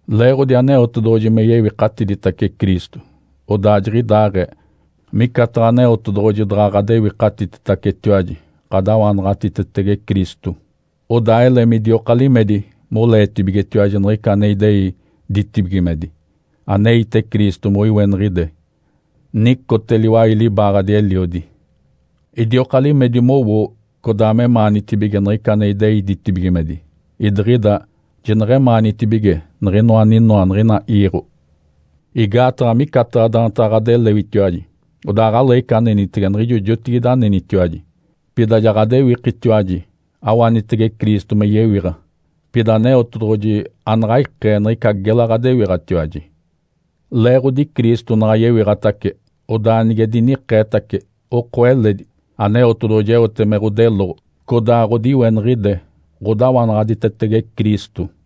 Leeɡ̶odi Aneotedoɡ̶oji me yewikatiditace Cristo, odaa jiɡ̶idaaɡ̶ee micataɡ̶a Aneotedoɡ̶oji daɡ̶a ɡ̶adewikatititacetiwaji ɡ̶adawanaɡ̶atitetege Cristo. Odaa ele midioka limedi moleetibigetiwaji niɡ̶ica ane idei ditibigimedi, aneite Cristo moiweniɡ̶ide, nicote liwai libaaɡ̶adi Eliodi. Idioka limedi mowoo codaa memaanitibige niɡ̶ica ane idei ditibigimedi, idiɡ̶ida jineɡ̶emaanitibige niɡ̶inoa aninoa niɡ̶ina iiɡ̶o. Igaataɡ̶a micataɡ̶a daantaɡ̶a ɡ̶adelewitiwaji (odaa aɡ̶aleeɡ̶ica anenitege niɡ̶ijo jotigide anenitiwaji), pida ja ɡ̶adewikitiwaji awanitege Cristo me yewiɡ̶a. Pida Aneotedoɡ̶oji anaɡ̶a ikee niɡ̶ica gela ɡ̶adewiɡ̶atiwaji. Leeɡ̶odi Cristo naɡ̶a yewiɡ̶atace, odaa nige dinikeetace, oko eledi, Aneotedoɡ̶oji eote me ɡ̶odeloɡ̶o codaa ɡ̶odiweniɡ̶ide ɡ̶odawanaɡ̶aditetege Cristo.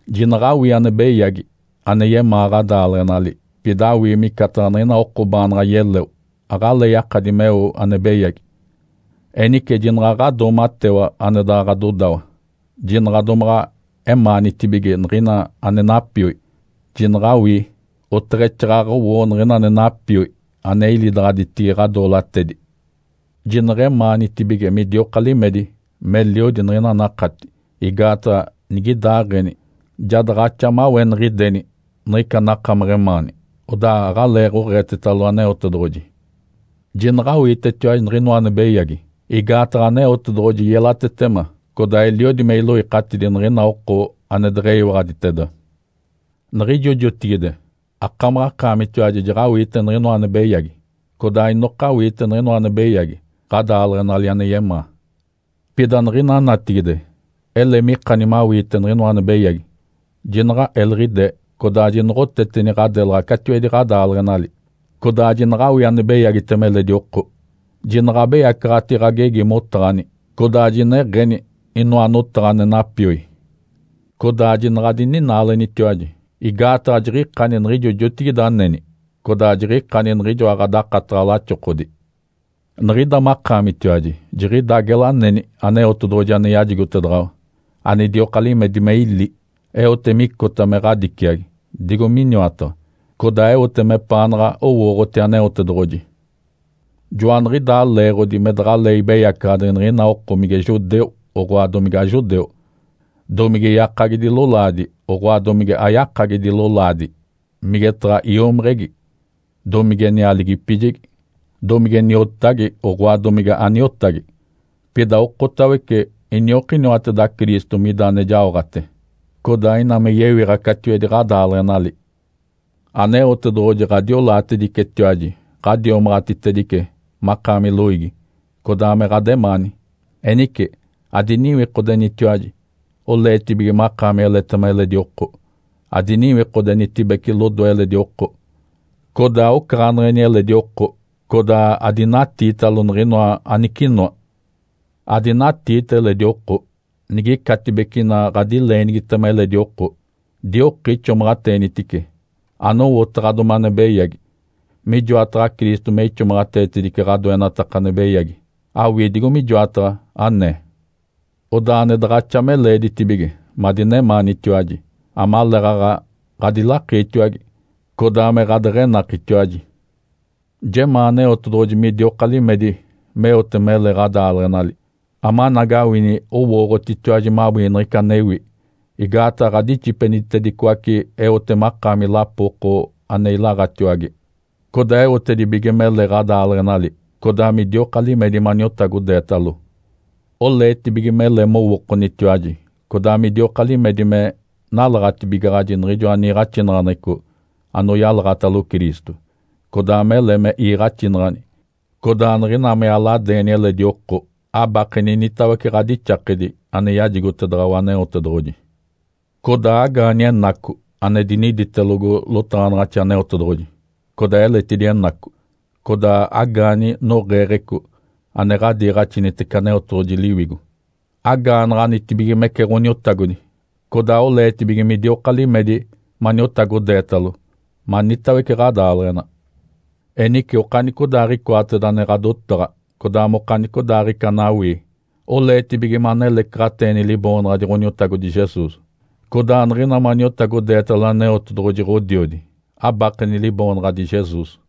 Jinaɡ̶awii ane beyagi ane yemaa ɡ̶adaaleɡ̶enali, pida awii micataɡ̶a niɡ̶ina oko baanaɡ̶a yeleo aɡ̶alee yakadi meo ane beyagi. Enice jinaɡ̶a ɡ̶adoomatewa ane daɡ̶a ɡ̶adodawa. Jinaɡ̶a domaɡ̶a emaanitibige niɡ̶ina ane napioi, jinaɡ̶awii, oteɡ̶exaaɡ̶aɡ̶a owoo niɡ̶ina ane napioi ane ilidaɡ̶aditigi ɡ̶adoolatedi. Jineɡ̶emaanitibige midioka limedi meliodi niɡ̶ina anakati, igaataɡ̶a nigidaaɡ̶eni ja daɡ̶axa maweniɡ̶ideni niɡ̶ica anakamaɡ̶a emaani, odaa aɡ̶alee oɡ̶eetetalo Aneotedoɡ̶oji. Jinaɡ̶awiitetiwaji niɡ̶inoa ane beyagi, igaataɡ̶a Aneotedoɡ̶oji yelatetema codaa eliodi me iloikatidi niɡ̶ina oko ane deɡ̶eyiwaɡ̶aditeda. Niɡ̶ijo jotigide akamaɡ̶akaamitiwaji jaɡ̶awiite niɡ̶inoa ane beyagi, codaa inoka awiite niɡ̶inoa ane beyagi ɡ̶adaaleɡ̶enali ane yemaa. Pida niɡ̶ina natigide ele mikani mawiite niɡ̶inoa ane beyagi, jinaɡ̶a eliɡ̶idee, codaa jinoɡ̶oteteni ɡ̶adelaɡ̶a catiwedi ɡ̶adaaleɡ̶enali, codaa jinaɡ̶awii ane beyagitema eledi oko. Jinaɡ̶abeyacaɡ̶ati ɡ̶agegi motaɡ̶ani, codaa jineɡ̶eni inoa notaɡ̶a ane napioi. Codaa jinaɡ̶adininaalenitiwaji, igaataɡ̶a jiɡ̶ikani niɡ̶ijo jotigide aneni codaa jiɡ̶ikani niɡ̶ijoa ɡ̶adakataɡ̶a laxokodi. Niɡ̶ida makaamitiwaji jiɡ̶ida gela aneni Aneotedoɡ̶oji ane yajigotedaɡ̶awa, anidioka limedi me ili, eote micota me ɡ̶adiciagi, digo miniwataɡ̶a, codaa eote mepaanaɡ̶a owooɡ̶oti Aneotedoɡ̶oji. Joaniɡ̶idaa leeɡ̶odi me daɡ̶alee ibeyacaɡ̶adi niɡ̶ina oko mige judeu, oɡ̶oa domige ajudeu; domige yakagidi lolaadi, oɡ̶oa domige ayakagidi lolaadi; migetaɡ̶a iomiɡ̶igi; domige nialigipijegi; domige niotagi, oɡ̶oa domige aniotagi. Pida okotawece iniokiniwateda Cristo mida ane jaoɡ̶ate, codaa ina me yewiɡ̶a catiwedi ɡ̶adaaleɡ̶enali. Aneotedoɡ̶oji ɡ̶adiolaatedicetiwaji, ɡ̶adiomaɡ̶atitedice makaami loiigi, codaa me ɡ̶ademaani. Enice adiniwikodenitiwaji, oleetibige makaami eletema eledi oko, adiniwikodenitibece lodoe eledi oko, codaa ocaɡ̶aneɡ̶eni eledi oko, codaa adinatiitalo niɡ̶inoa anicinoa. Adinatiita eledi oko. Nigicatibece ina ɡ̶adileenigitema eledi oko, dioki ixomaɡ̶ateenitice anowotaɡ̶adomi ane beyagi. Mijoataɡ̶a Cristo me ixomaɡ̶ateetedice ɡ̶adoenataka ane beyagi, awii digo mijoataɡ̶a anee. Odaa ane daɡ̶axa me leeditibige madinemaanitiwaji, amaleeɡ̶aɡ̶a ɡ̶adilakiitiwage, codaa me ɡ̶adeɡ̶enakitiwaji. Jemaa Aneotedoɡ̶oji midioka limedi meote mele ɡ̶adaaleɡ̶enali, amanagawini owooɡ̶otitiwaji mawii niɡ̶ica anewi. Igaataɡ̶a ɡ̶adixipenitedicoace eote makaami lapo oko ane ilaɡ̶atiwage, codaa eotedibige mele ɡ̶adaaleɡ̶enali. Codaa midioka limedi maniotagodeetalo. Oleetibige mele mowookonitiwaji codaa midioka limedi me nalaɡ̶atibigaɡ̶aji niɡ̶ijoa niiɡ̶axinaɡ̶aneɡ̶eco anoyalaɡ̶atalo Cristo, codaa mele me iiɡ̶axinaɡ̶ani, codaa niɡ̶ina me aladeeni eledi oko, abakeni initawece ɡ̶adixakedi ane yajigotedaɡ̶awa Aneotedoɡ̶oji. Codaa agaani Enaco ane diniditelogo lotaɡ̶anaɡ̶axi Aneotedoɡ̶oji, codaa eletidi Enaco, codaa agaani noɡ̶eeɡ̶eco ane ɡ̶adiiɡ̶axinitece Aneotedoɡ̶oji Liwigo. Agaanaɡ̶anitibigimece Ǥoniotagodi, codaa oleetibige midioka limedi maniotagodeetalo manitawece ɡ̶adaaleɡ̶ena. Enice okanicodaaɡ̶icoateda ane ɡ̶adotaɡ̶a, codaa mokanicodaaɡ̶ica anawii, oleetibige manelecaɡ̶ateeni Liboonaɡ̶adi Ǥoniotagodi Jesus. Codaa niɡ̶ina maniotagodeetalo Aneotedoɡ̶oji, Ǥodiodi, abakeni Liboonaɡ̶adi Jesus.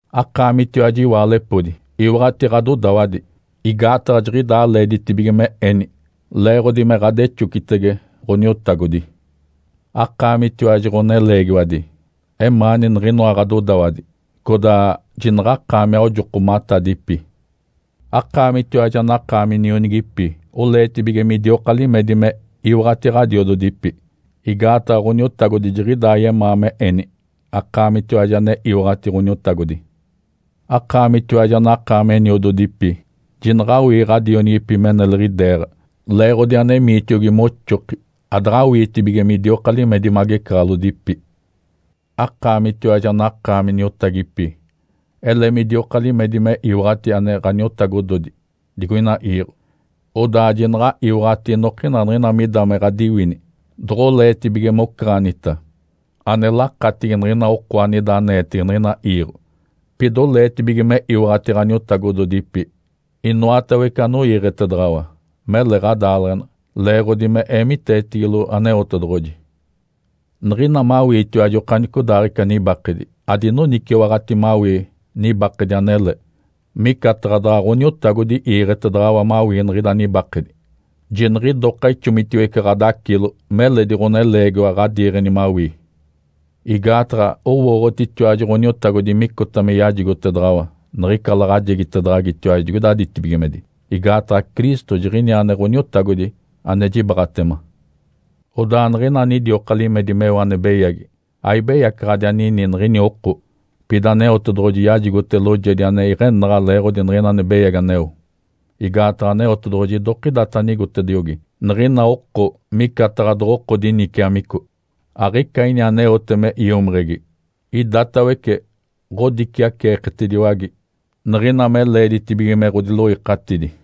Akaamitiwaji, iwaalepodi, iwaɡ̶ati ɡ̶adodawadi, igaataɡ̶a jiɡ̶idaa leeditibige me eni leeɡ̶odi me ɡ̶adexocitege Ǥoniotagodi. Akaamitiwaji, ɡ̶oneleegiwadi, emaani niɡ̶inoa ɡ̶adodawadi, codaa jinaɡ̶akaami aojokomatadipi. Akaamitiwaji anakaami nionigipi, oleetibige midioka limedi me iwaɡ̶ati ɡ̶adiododipi, igaataɡ̶a Ǥoniotagodi jiɡ̶idaa yemaa me eni, akaamitiwaji ane iwaɡ̶ati Ǥoniotagodi. Akaamitiwaji anakaami eniododipi, jinaɡ̶awii ɡ̶adionigipi me neliɡ̶ideeɡ̶a leeɡ̶odi anemiitiogi moxoki, adaɡ̶awiitibige midioka limedi magecaɡ̶alodipi. Akaamitiwaji anakaami niotagipi, ele midioka limedi me iwaɡ̶ati ane ɡ̶aniotagodi digoina iiɡ̶o. Odaa jinaɡ̶a iwaɡ̶ati inokina niɡ̶ina mida me ɡ̶adiwini doɡ̶oleetibige mocaɡ̶anita, ane lakatigi niɡ̶ina oko anida aneetege niɡ̶ina iiɡ̶o. Pida oleetibige me iwaɡ̶ati ɡ̶aniotagododipi inoatawece anoiiɡ̶etedaɡ̶awa, mele ɡ̶adaaleɡ̶ena, leeɡ̶odi me eemiteetigilo Aneotedoɡ̶oji. Niɡ̶ina mawiitiwaji okanicodaaɡ̶ica nibakedi, adinoniciwaɡ̶ati mawii nibakedi anele, micataɡ̶a daɡ̶a Ǥoniotagodi iiɡ̶etedaɡ̶awa mawii niɡ̶ida nibakedi, jiniɡ̶idoka ixomitiwece ɡ̶adacilo meledi ɡ̶oneleegiwa ɡ̶adiiɡ̶eni mawii. Igaataɡ̶a owooɡ̶otitiwaji Ǥoniotagodi micota me yajigotedaɡ̶awa niɡ̶ica laɡ̶ajegitedaɡ̶agitiwaji digoida ditibigimedi. Igaataɡ̶a Cristo jiɡ̶iniaa ane Ǥoniotagodi ane jibaaɡ̶atema. Odaa niɡ̶ina anidioka limedi meo ane beyagi aibeyacaɡ̶adi anini niɡ̶ini oko, pida Aneotedoɡ̶oji yajigote loojedi ane iɡ̶enaɡ̶a leeɡ̶odi niɡ̶ina ane beyagi aneo. Igaataɡ̶a Aneotedoɡ̶oji idokidata anigotediogi niɡ̶ina oko micataɡ̶a doɡ̶oko diniciamico. Aɡ̶ica ini aneote me iomiɡ̶igi idatawece ɡ̶odiciaceeketediwage niɡ̶ina me leeditibige me ɡ̶odiloikatidi.